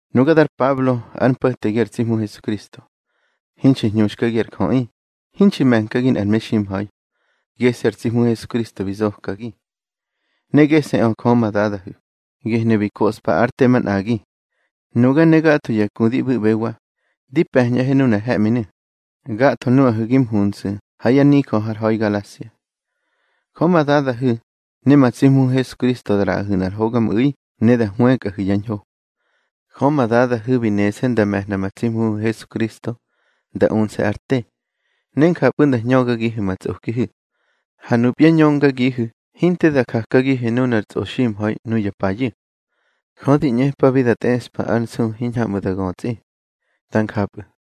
Nuga dar Pablo, ár mpo̱tegi ar tsi Hmu Hesukristo. Hinxi hñuxkagi ar jöꞌi, hinxi me̱nkagi nꞌar meximha̱i. Gese̱ ar tsi Hmu Hesukristo bi zokagi, ne gese̱ꞌö Jö ma Dadahu̱, gehnu̱ bi koꞌspa ár te manꞌagi. Nuga ne gatho ya ku di ꞌbu̱ꞌbewa, di pe̱ñꞌahe nunar he̱ꞌminu̱, gatho nuꞌahu̱ gi mhunsu̱ ha ya nijö hár ha̱i Galasia. Jö ma Dadahu̱ ne ma tsi Hmuhu̱ Hesukristo da ꞌraꞌahu̱ nꞌar hogamꞌu̱i ne da hwëkꞌahu̱ yá ñho. Jö ma Dadahu̱ bi nese̱ nda me̱hna ma tsi Hmuhu̱ Hesukristo nda unse̱ ár te, ne njapꞌu̱ nda hñögagihu̱ ma tsꞌokihu̱. Ha nupya ñöngagihu̱ hinte da jakagihu̱ nunar tsꞌoximha̱i nuya payu̱. Jö di ꞌñepabi da tꞌeꞌspa ár nsu hiñhamꞌu̱ da götsꞌi. Dá njapꞌu̱.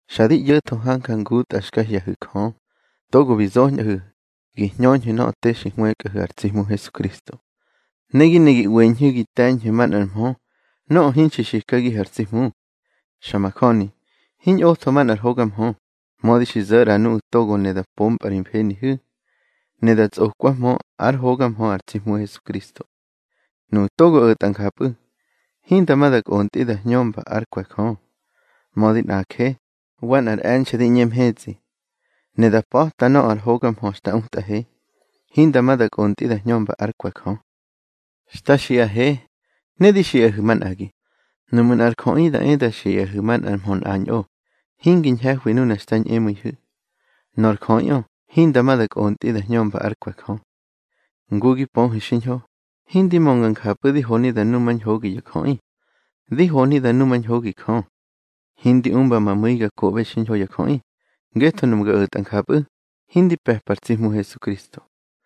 Xa di ꞌyo̱tho hanja ngutꞌa xka hye̱hu̱ Jö, togo bi zoñꞌahu̱ gi hñöñhu̱ nöꞌö te xi hwëkꞌahu̱ ar tsi Hmu Hesukristo. Ne gi ne gi ꞌweñhu̱ gi te̱ñhu̱ manꞌar mhö nöꞌö hinxi xikagihu̱ ar tsi Hmu. Xa majöni, hiñꞌotho manꞌar hoga mhö, mödi xi zo̱ ꞌra nuꞌu̱ togo ne da pompꞌa ri mfenihu̱, ne da tsꞌokwahmö ár hoga mhö ar tsi Hmu Hesukristo. Nuꞌu̱ togo o̱tꞌa njapꞌu̱, hinda ma da kꞌontꞌi da hñömba ár kwe̱ Jö. Mödi nꞌaje, wa nꞌar e̱nxe̱ di ꞌñe mhetsꞌi, ne da pa̱ta nöꞌö ar hoga mhö xta utꞌahe, hinda ma da kꞌontꞌi da hñömba ár kwe̱ Jö. Xta xiꞌahe, ne di xiꞌahu̱ manꞌagi, nuꞌmu̱ nꞌar jöꞌi da e da xiꞌahu̱ manꞌar mhö nꞌañꞌo, hingi ñhe̱hwi nuna xka ñꞌemu̱ihu̱, nor jöꞌiꞌö hinda ma da kꞌontꞌi da hñömba ár kwe̱ Jö. Ngu gi pöhu̱ xiñho, hindi mönga njapꞌu̱ di honi da numañhogi ya jöꞌi. Di honi da numañhogi Jö. Hindi umba ma mu̱i ga koꞌbe xiñho ya jöꞌi, ngetho nuꞌmu̱ ga o̱tꞌa njapꞌu̱, hindi pe̱pa ar tsi Hmu Hesukristo.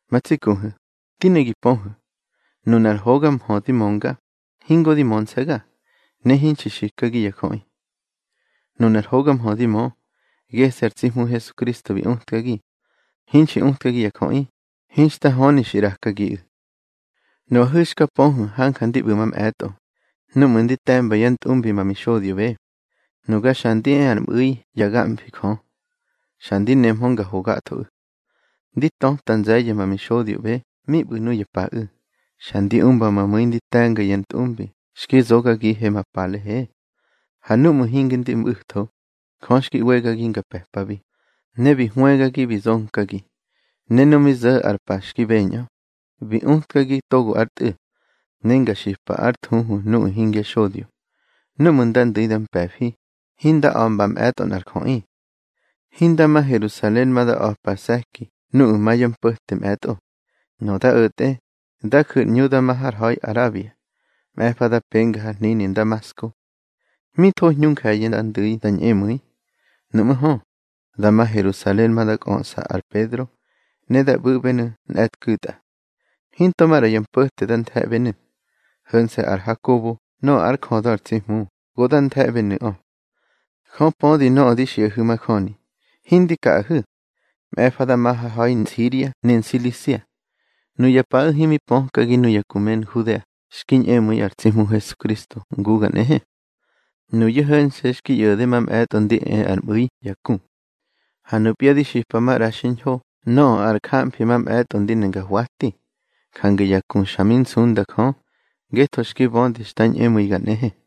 Ma tsi kuhu̱, di ne gi pöhu̱, nunar hoga mhö di mönga, hingo di mönse̱ga, ne hinxi xikagi ya jöꞌi. Nunar hoga mhö di mö, gese̱ ar tsi Hmu Hesukristo bi utkagi. Hinxi utkagi ya jöꞌi, hinxta höni xi ꞌrakagiꞌu̱. Nuꞌahu̱ xka pöhu̱ hanja ndi ꞌbu̱ mamꞌe̱tꞌo núꞌmu̱ ndi te̱mba yá ntꞌumbi ma mixodyoꞌbe. Nuga xa ndi e ar mꞌu̱i yá gamfi Jö, xa ndi nemhö nga ho gathoꞌu̱. Ndi töta nze̱ye̱ ma mixodyoꞌbe mi ꞌbu̱ nuya paꞌu̱. Xa ndi umba ma mu̱i ndi te̱nga ya ntꞌumbi xki zogagihe ma palehe. Ha núꞌmu̱ hinge ndi mꞌu̱tho, Jö xki ꞌwegagi nga pe̱pabi, ne bi hwëgagi bi zonkagi. Ne nu mi zo̱ ar pa xki beñꞌö, bi utkagi togo ár Tꞌu̱, ne nga xipa ár thuhu nuꞌu̱ hingya xodyo. Núꞌmu̱ nda ndu̱i da mpe̱fi, hinda a̱mba mꞌe̱tꞌo nꞌar jöꞌi. Hinda ma Herusalen ma da a̱par se̱ki nuꞌu̱ ma yá mpo̱te mꞌe̱tꞌo. Nöꞌö da o̱tꞌe, da ju̱ ar ꞌñu da ma har ha̱i Arabia. Mꞌe̱fa da penga har hnini Ndamasko. Mi tho hñu nje̱ye̱ da ndu̱i da ñꞌemu̱i, nuꞌmú̱ hö, da ma Herusalen ma da kꞌöꞌsa ar Pedro, ne da ꞌbu̱ꞌbenu̱ nꞌe̱tku̱tꞌa. Hinto maꞌra ya mpo̱te da nthe̱ꞌbenu̱, ho̱nse̱ ar Hakobo nöꞌö ár jödö ar tsi Hmu go da nthe̱ꞌbenu̱ꞌö. Jö pödi nöꞌö di xiꞌahu̱ majöni, hindi kaꞌahu̱. Mꞌe̱fa da ma har ha̱i Nsiria ne Nsilisia. Nuya paꞌu̱ himi pökagi nuya ku me Nhudea xki ñꞌemu̱i ar tsi Hmu Hesukristo nguga nꞌehe. Nuyu̱ ho̱nse̱ xki ꞌyo̱de mamꞌe̱tꞌo ndi e ar mꞌu̱i ya ku. Ha nupya di xipa maꞌra xiñho nöꞌö ar jamfi mamꞌe̱tꞌo ndi ne nga hwati. Jange ya ku xa mi nsunda Jö, ngetho xki bödi xta ñꞌemu̱iga nꞌehe.